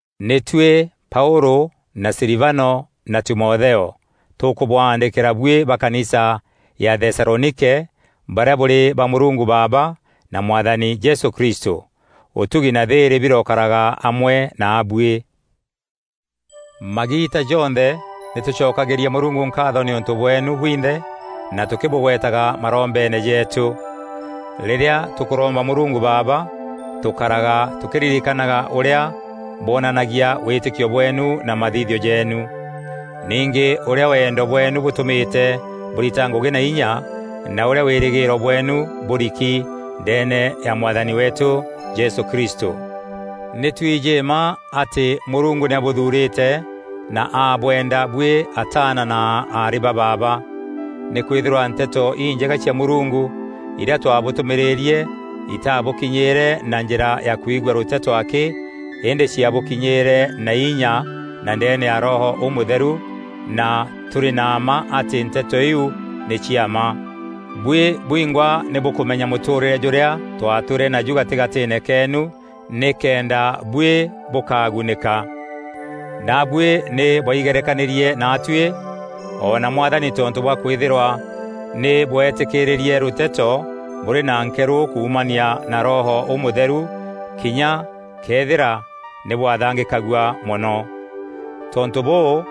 Nî tuî Paûlû na Silivano na Timotheo, Tûkûbwaandîkîra buî ba kanisa ya Thesalonike barîa bûrî ba Mûrungu Baaba na Mwathani Jesû Kristû. Ûtugi na thîîrî birokaraga amwe naabuî. Magiita jonthe nî tûcokagîria Mûrungu nkaatho nîûntû bweenu bwinthe na tûkîbûgwetaga marombeene jeetû. Rîrîa tûkûromba Mûrungu Baaba, tûkaraga tûkîririkanaga ûrîa bwonanagia wîtîkio bweenu na mathithio jeenu. Ningî ûrîa wendo bweenu bûtûmîte bûrita ngûgî na inya na ûrîa wîrîgîîro bweenu bûriki ndeene ya Mwathani weetû Jesû Kristû. Nî twijî mma atî Mûrungu nî abûthuurîte na abweenda buî ataana na aarî ba baaba. Nîkwîthîrwa Nteto Injega cia Mûrungu irîa twabûtûmîîrîrie itaabûkinyîîre na njîra ya kwigua rûteto akî, îndî ciabûkinyîîre na inya na ndeene ya Roho Ûmûtheru na tûrî na mma atî nteto iu nî cia mma. Buî bwingwa nî bûkûmenya mûtûûrîre jûrîa twatwîre naju gatîgatîîne keenu nîkenda buî bûkagunîka. Naabuî nî bwaigerekanîrie naatuî o na Mwathani tontû bwa kwîthîrwa nî bweetîkîrîrie rûteto bûrî na nkerû kuumania na Roho Ûmûtheru, kinya këethîra nî bwathangîkagua mono. Tontû bûû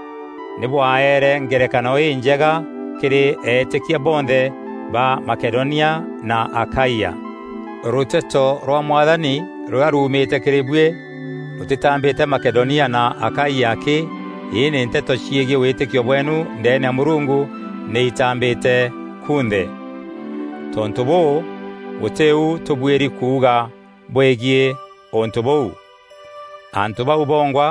nî bwaeere ngerekano înjega kîrî eetîkia bonthe ba Makedonia na Akaia. Rûteto rwa Mwathani rûrîa ruumîte kîrî bwî rûtîtambîte Makedonia na Akaia akî, îndî nteto ciegiî wîtîkio bweenu ndeene ya Mûrungu nî itambîte kunthe. Tontû bûû, gûtî u tûbuîri kuuga bweîgiî untû bûu. Antû bau bongwa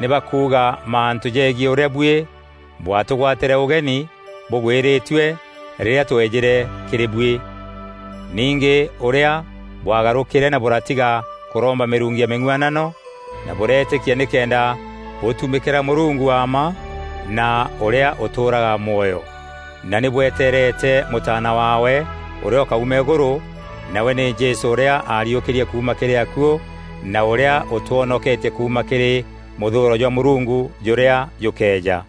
nî bakuuga mantû jeegiî ûrîa buî bwatûgwatîre ûgeni bûgwîrîtue rîrîa tweejîre kîrî buî. Ningî ûrîa bwaagarûkîre na bûratiga kûromba mîrungu ya mîng'uanano na bûreetîkia nîkenda bûtumîkîra Mûrungu wa mma na ûrîa ûtûûraga mwoyo, na nî bweteerete Mûtaana waawe ûrîa ûkauma îgûrû, nawe nî Jesû ûrîa aariûkîrie kuuma kîrî akuû na ûrîa ûtwonoketie kuuma kîrî mûthûûro jwa Mûrungu jûrîa jûkeeja.